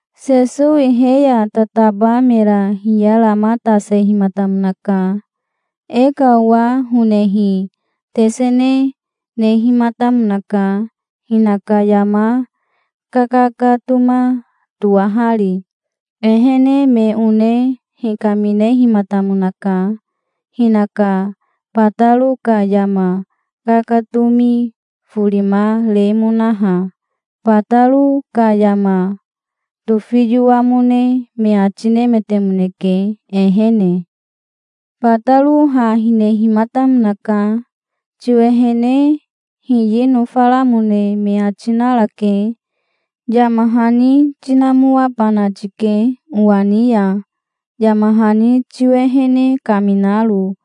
Sesowi he ya tataba mera hiyaramatasehimatamonaka. "E ka owa honehi tesene nehimatamonaka hinaka yama kakakatoma toahari. Ehene me one hikaminehimatamonaka hinaka bataro ka yama kakatomi forima remonaha. Bataro ka yama tofiyoamone me ati nemetemoneke ehene". "Bataro ha hinehimatamonaka. 'Tiwehene hiyi nofaramone me ati narake. Yama hani tinamoabana tike, owa ni ya, yama hani tiwehene kaminaro,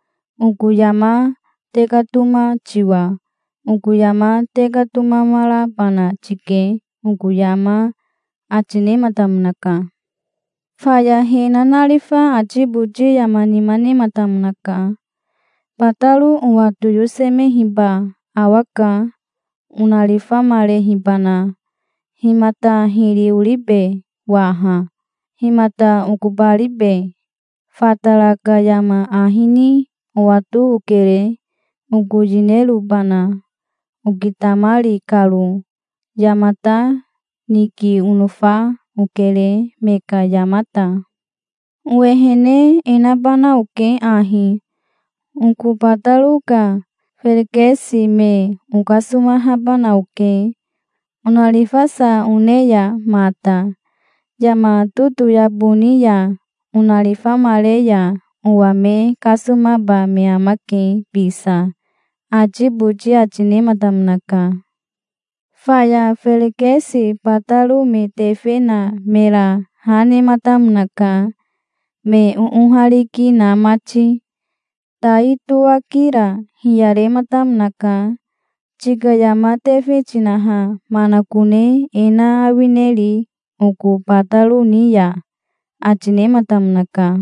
oko yama tekatoma tiwa. Oko yama tekatomamarabana tike oko yama', ati nematamonaka". "Faya he nanarifa ati boti yama nima nematamonaka. 'Bataro owa toyosemehiba awaka, onarifamarehibana. Himata hiri oribe waha? Himata okobaribe? Fatara ka yama ahi ni owato okere, oko yinerobana, okitamari karo. Yamata niki onofa okere me ka yamata. Owehene e nabana oke ahi: oko bataro ka ferekesi me okasomahabana oke, onarifasa one ya mata. Yama totoyabo ni ya onarifamare ya owa me kasomaba me amake bisa', ati boti ati nematamonaka". "Faya ferekesi bataro me tefe na mera ha nematamonaka, me oohariki na mati. Tai tohaki ra hiyarematamonaka. 'Tika yama tefe tinaha manakone e na awineri oko bataro ni ya?' ati nematamonaka.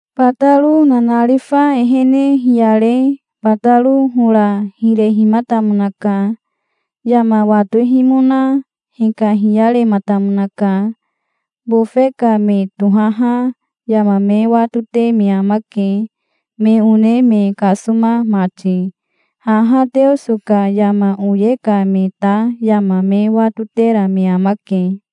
"Bataro nanarifa ehene hiyare bataro hora hirehimatamonaka. Yama watohimona hikahiyarematamonaka. Bofe ka me tohaha yama me watote me amake, me one me kasoma mati. Haha Teoso ka yama oye ka me ta yama me watotera me amake".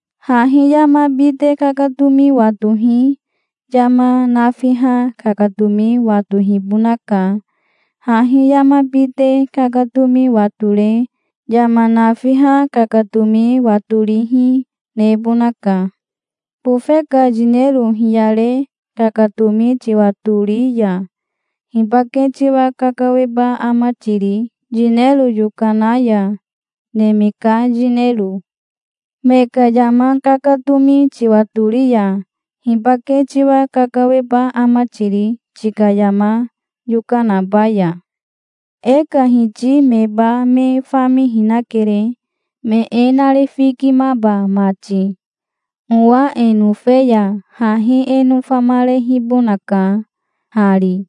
Hahi yama bite kakatomi watohi yama nafiha kakatomi watohibonaka. Hahi yama bite kakatomi watore yama nafiha kakatomi watorihi nebonaka. Bofe ka yinero hiyare kakatomi tiwatori ya hibake tiwa kakaweba ama tiri yinero yokana ya, neme ka yinero? Me ka yama kakatomi tiwatori ya, hibake tiwa kakaweba ama tiri, tika yama yokanaba ya? E ka hiti meba me famihinakere, me e narifikimaba mati. Owa e nofe ya hahi e nofamarehibonaka hari.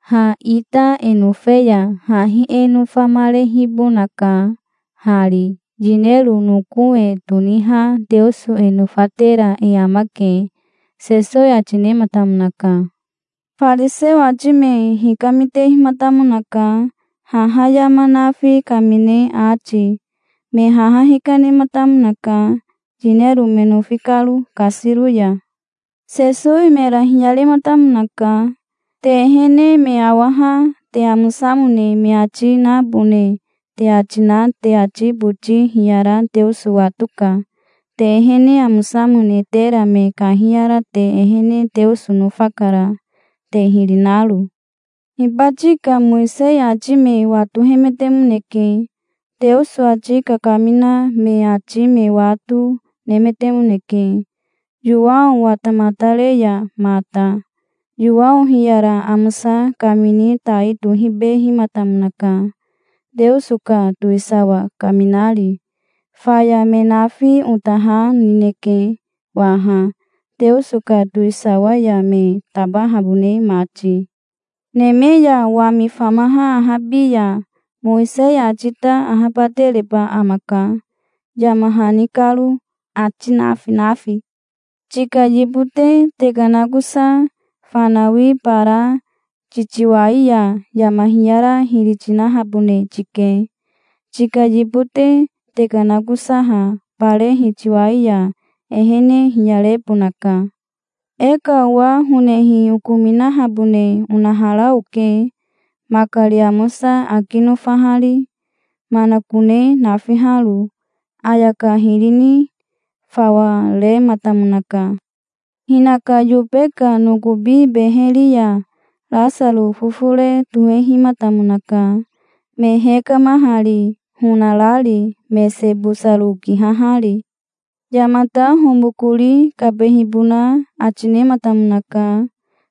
Ha ita e nofe ya hahi e nofamarehibonaka hari. Yinero noko e toniha Teoso e nofatera e amake", Sesowi ati nematamonaka. Fariseo ati me hikamitehimatamonaka haha yama nafi kamine ati. Me haha hikanematamonaka, yinero me nofi karo kasiro ya. Sesowi mera hiyarematamonaka. "Te ehene me awaha te amosamone me ati nabone te ati na te ati boti hiyara Teoso watoka. Te ehene amosamone tera me kahiyara te ehene Teoso nofakara, te hiri naro". "Hibati ka Mowisei ati me watohemetemoneke. Teoso ati kakamina me ati me wato, nemetemoneke, Yowao watamatare ya mata. Yowao hiyara amosa kamini tai tohibehimatamonaka, Teoso ka towisawa kaminari. Faya me nafi ota ha nineke, waha, Teoso ka towisawa ya me tabahabone mati". "Neme ya wami famaha ahabi ya Mowisei ati ta ahabatereba amaka, yama hani karo, ati nafi nafi. Tika yibote tekanakosa fanawi bara titiwai ya yama hiyara hiri tinahabone tike. Tika yibote tekanakosaha bare hitiwai ya ehene hiyarebonaka". "E ka owa honehi okominahabone onahara oke, makari amosa aki nofahari manakone nafiharo. Ayaka hiri ni fawa rematamonaka. Hinaka yobe ka nokobi beheri ya Rasaro fofore tohehimatamonaka, me hekamahari, honarari, mese bosaro kihahari. Yamata homokori kabehibona ati nematamonaka,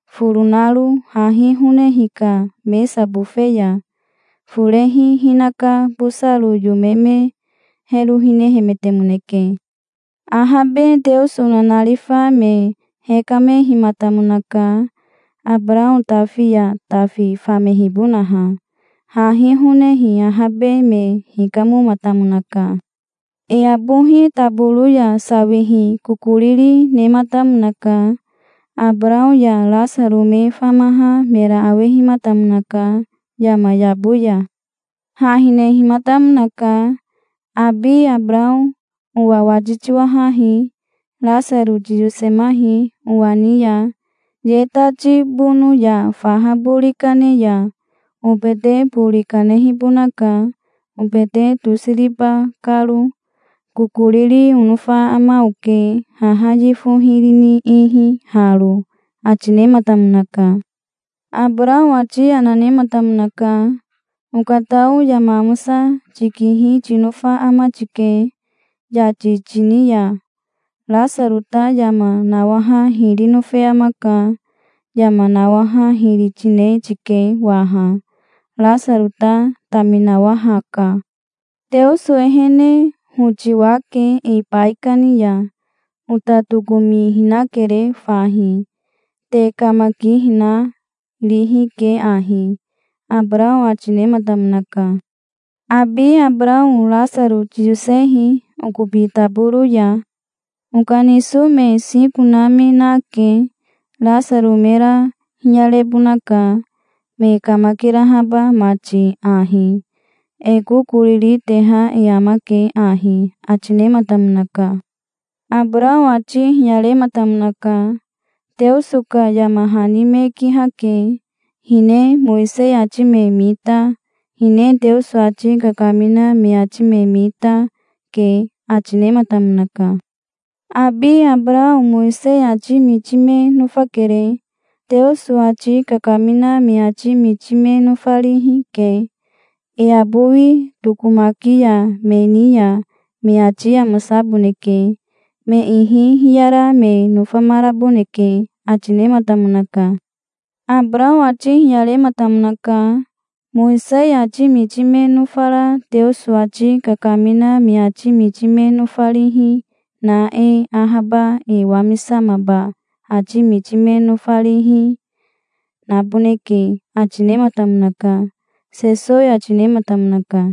foro naro hahi honehi ka mesa bofe ya. Forehi hinaka bosaro yome me hero hinehemetemoneke". "Ahabe Teoso nanarifa me hekamehimatamonaka, Abarao tafi ya tafi famehibonaha. Hahi honehi ahabe me hikamomatamonaka. E abohi taboro ya sawihi kokoriri nematamonaka. Abarao ya Rasaro me famaha mera awehimatamonaka yama yabo ya. Ha hinehimatamonaka. 'Abi Abarao owa wati tiwahahi. Rasaro tiyosemahi owa ni ya. Ye tati bono ya faha bori kane ya obete bori kanehibonaka, obete tosiriba karo. Kokoriri onofa ama oke haha yifo hiri ni ihi haro', ati nematamonaka". "Abarao ati yana nematamonaka. 'Okatao yama amosa tikihi tinofa ama tike, yati tini ya. Rasaro ta yama nawaha hiri nofe amaka. Yama nawaha hiri tine tike waha. Rasaro ta taminawahaka. Teoso ehene hoti wake e baikani ya. Ota tokomihinakere fahi. Te kamakihina rihi ke ahi', Abarao ati nematamonaka". "'Abi Abarao Rasaro tiyosehi okobi taboro ya. Okaniso me siko na me nake. Rasaro mera hiyarebonaka, me kamakirahaba mati ahi. E kokoriri teha e amake ahi', ati nematamonaka". "Abarao ati hiyarematamonaka. 'Teoso ka yama hani me kihake. Hine Mowisei ati me mita, hine Teoso ati kakamina me ati me mita, ke', ati nematamonaka". "'Abi Abarao Mowisei ati miti me nofakere, Teoso ati kakamina me ati miti me nofarihi ke. E abowi tokomaki ya me ni ya me ati amosaboneke. Me ihi hiyara me nofamaraboneke', ati nematamonaka". "Abarao ati hiyarematamonaka. 'Mowisei ati miti me nofara Teoso ati kakamina me ati miti me nofarihi na e ahaba e wamisamaba ati miti me nofarihi, naboneke', ati nematamonaka", Sesowi ati nematamonaka.